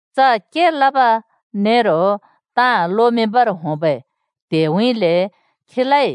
च के लब नेरो ताँ लोमिंबर होंबै त्हेउँइँले खीलाइ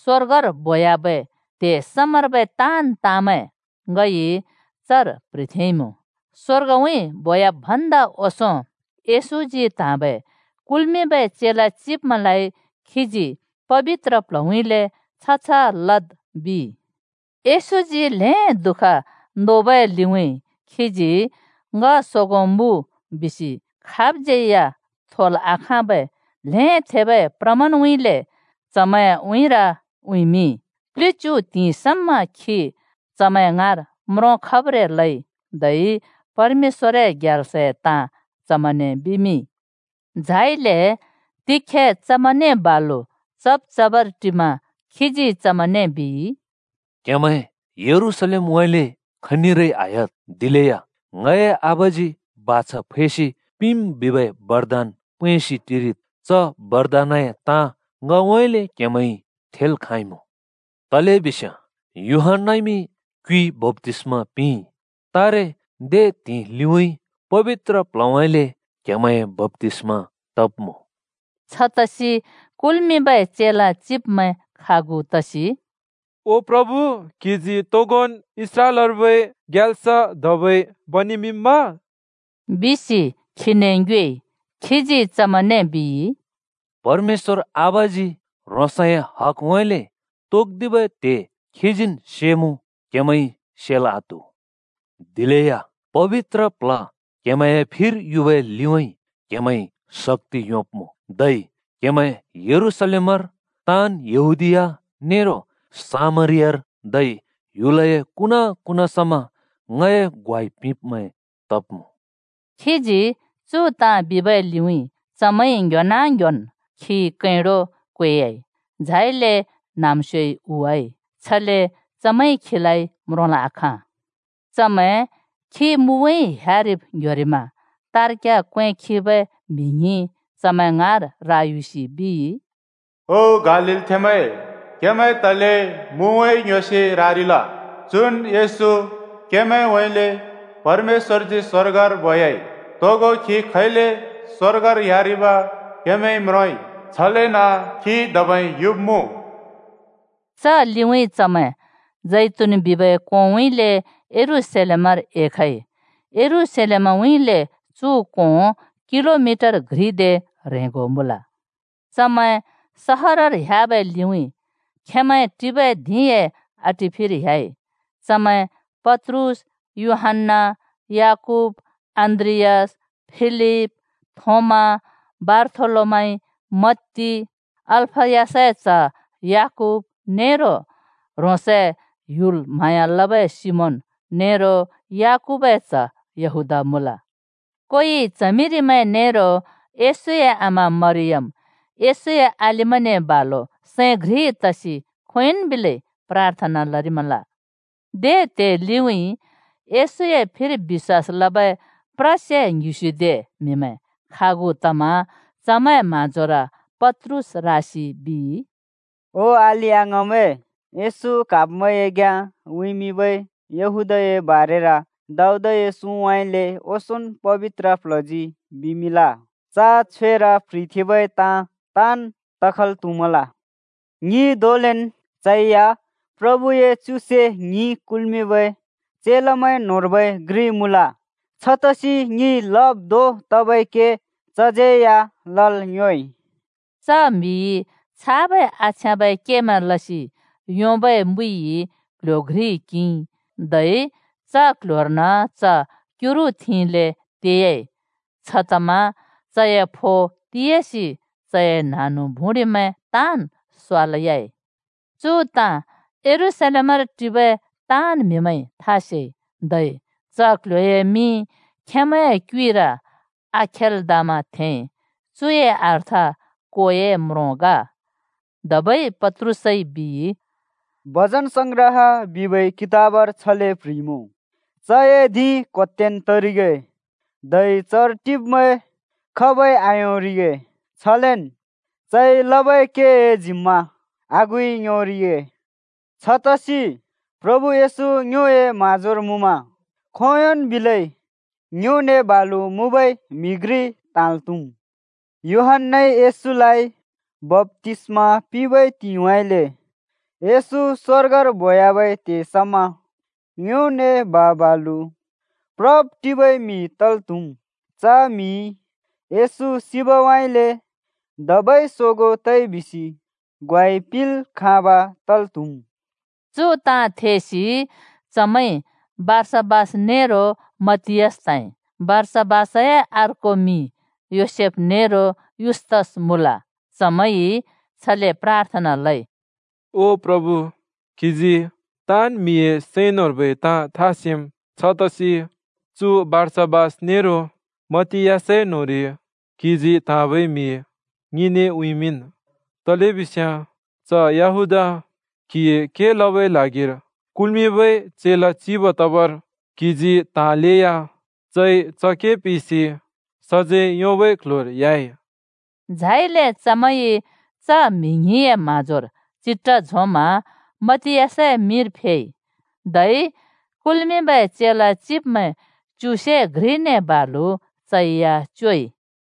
स्‍वर्गर बोह्‍याबै त्हे समार्बै ताँन् ताँमैं ङइ चर प्ह्रिथेंइँमुँ। स्वर्गउँइँ बोयाब् भन्दा ओंसों येशूजी त्‍हाँबै कुल्मिंबै चेला चिब्मैंलाइ खीजी पबित्र प्ल्हउँइँले “छ-छ लद्” बिइ। येशूजी ल्हें दुःख नोबै लिउँइँ खीजी “ङ सोगों मुँ” बिसि खाबज्यै या थोल् आखाँबै ल्हें थेबै प्रमाणउँइँले चमैंए उँइँर उँइँमिंइ। प्लिच्यु त्हिंइ समा खी चमैं ङाँर म्रोंखब्रें लइ धै परमेश्‍वरए ग्याल्सए ताँ चमैंने बिमिंइ। झाइले तिखे चमैंने बालु चब् चबर टिमा खीजी चमैंने बिइ, “क्हेमैं यरूशलेमउँइँले खनिरै आह्‍याद्। दिलेया ङए आबाजी बाछा फैसि पिंम् बिबै बरदान पैंसि टिरिद्। च बरदानए ताँ ङउँइँले क्हेमैंइ थेल् खाँइमुँ। तलेबिस्याँ यूहन्‍नाइमि क्युइ बप्‍तिस्‍मा पिंइ, तारे दे त्हिंइ लिउँइँ पबित्र प्ल्हउँइँले क्हेमैंए बप्‍तिस्मा तब्‍मुँ।” छतसि कुल्मिंबै चेला चिब्मैं खागु तसि, “ओ प्रभु, क्‍हिजी तोगोन् इस्राएलर्बै ग्याल्स धबै बनेमिंम्मा?” बिसि खीने ङ्योएइ। खीजी चमैंने बिइ, “परमेश्‍वर आबाजी ह्रोंसए हगउँइँले तोक्‍दिबै त्हे खीजीन् सेमुँ, क्‍हेमैंइ सेल् आत्‍हु। दिलेया पबित्र प्ल्ह क्‍हेमैंए फिर युबै लिउँइँ क्‍हेमैंइ शक्‍ति योंब्‍मुँ। धै क्हेमैं यरूशलेमर, ताँन् यहूदीया नेरो सामरियार, धै ह्‍युलए कुना-कुना समा ङए ग्वाइ पिंब्मैं तब्मुँ।” खीजी चु ताँ बिबै लिउँइँ चमैंइ ङ्‍ह्‍योना ङ्‍ह्‍योन् खी कैंडो क्वेयाइ, झाइले न्‍हाँम्‍स्योइ हुवाइ। छले चमैंइ खीलाइ म्रोंल् आखाँ। चमैं खी मुउँइँ ह्‍यारिब् ङ्‍ह्‍योरिमा तार्ग्‍या क्‍वें खिबै म्हि ङ्हिं चमैं ङाँर रायुसि बिइ, “ओ गालीलथेंमैं, क्हेमैं तले मुउँइँ ङ्‍ह्‍योसि रारिल? चुन् येशू, क्हेमैंउँइँले परमेश्‍वरजी स्वर्गर बोयाइ। तोगो खी खैले स्वर्गर ह्‍यारिब क्हेमैंइ म्रोंइ छलेन खी धबै युब्मुँ।” च लिउँइँ चमैं जैतून बिबै कोंउँइँले यरूशलेमर एखइ। यरूशलेमउँइँले चु कों किलोमिटर घ्रि दे ह्रेंगो मुँल। चमैं सहरर ह्‍याबै लिउँइँ खेंमैं टिबै धिंए आटिफिर ह्‍याइ। चमैं पत्रुस, यूहन्‍ना, याकूब, अन्‍द्रियास, फिलिप, थोमा, बारथोलोमाइ, मत्ती, अल्‍फयसए च्‍ह याकूब, नेरो ह्रोंसए ह्‍युल म्हाँया लबै सिमोन, नेरो याकूबए च्‍ह यहूदा मुँल। कोइ च्हमिरिमैं नेरो येशूए आमा मरियम, येशूए अलिमैंने बालु सैं घ्रि तसि खोंयोंन् बिलै प्राथना लरिमल। दे त्हे लिउँइँ येशूए फिर बिश्‍वास लबै प्रसे ङ्हिस्युदे म्हिमैं खागु तमा चमैंए म्हाँजोर पत्रुस रासि बिइ, “ओ अलि-अङाँमैं, येशू क्हाब्मैंए घ्‍याँ उँइँमिंबै यहूदाए बारेर दाऊदए सुँउँइँले ओंसोंन् पबित्र प्ल्हजी बिमिंल। च छ्‍वेर प्ह्रिथेंबै ताँ ताँन् तखल् त्हुमल। ङि धोंलेन् चैया प्रभुए च्युसे ङ्हि कुल्मिंबै चेलामैं न्होंर्बै घ्रि मुँल, छतसि ङिइ लब् धों तबै के चज्यै या लल् योंइ।” (च म्हिइ छाबै आछ्याँबै केमैं लसि योंबै मुइइ क्ल्ह्‍यो घ्रि किंइ, धै च क्ल्ह्‍योर्न च क्युरु थिंले तेयाइ। छतमा चए फो तियासि चए न्हाँनु-भुँडिमैं ताँन् स्वालयाइ। चु ताँ यरूशलेमर टिबै ताँन् म्हिमैंइ था सेइ। धै च क्ल्ह्‍योए मिं खेंमैंए क्युइर आखेल्दामा थेंइ। चुए अर्थ कोए म्रों ग।) धबै पत्रुसइ बिइ, “भजनसंग्रह बिबै कितबर छले प्‍ह्रिइमुँ, ‘चए धिं क्होत्‍तेन् तरिगे, धै चर टिब्मैं खाबइ आयोंरिगे।’ छलेन ‘चइ लबै केए जिम्मा आगुइ योंरिगे।’ छतसि प्रभु येशू ङ्योए म्हाँजोर मुँमा खोंयोंन् बिलै ङ्योने बालु मुँबै म्हि घ्रि त्हाँल् त्हुम्। यूहन्‍नाइ येशूलाइ बप्‍तिस्‍मा पिंबै त्हिंइउँइँले येशू स्वर्गर बोवाबै त्हे समा ङ्योने बा-बालु प्रब्-टिबै म्हि तल् त्हुम्। च म्हिइ येशू सिबउँइँले धबै सोगों तइ बिसि ग्वाइ पिंल् खाँब तल् त्हुम्।” चु ताँ थेसि चमैंइ बारसा‍बास नेरो मतियास त्हाँइ। (बारसा‍बासए अर्को मिंमैं योसेफ नेरो युस्तस मुँल।) चमैंइ छले प्राथना लइ, “ओ प्रभु, क्‍हिजी ताँन् म्‍हिए सैं न्‍होंर्बै ताँ था सेम्। छतसि चु बारसाबास नेरो मत्तियासए न्‍होंरि क्‍हिजी त्‍हाँबै म्हि ङिने उँइँमिंन्। तलेबिस्याँ च यहूदा क्हिए के लबै ल्हागिर कुल्मिंबै चेला चिब तबर क्हिजी त्हाँलेया चइ च के पिसि सजैं योंबै क्ल्ह्‍योर ह्‍याइ।” झाइले चमैंइ च म्हि ङ्हिंए म्हाँजोर चिट्ठा झोंमा मतियासए मिंर फेइ, धै कुल्मिंबै चेला चिब्मैं च्युसे घ्रिने बालु चैया च्योइ।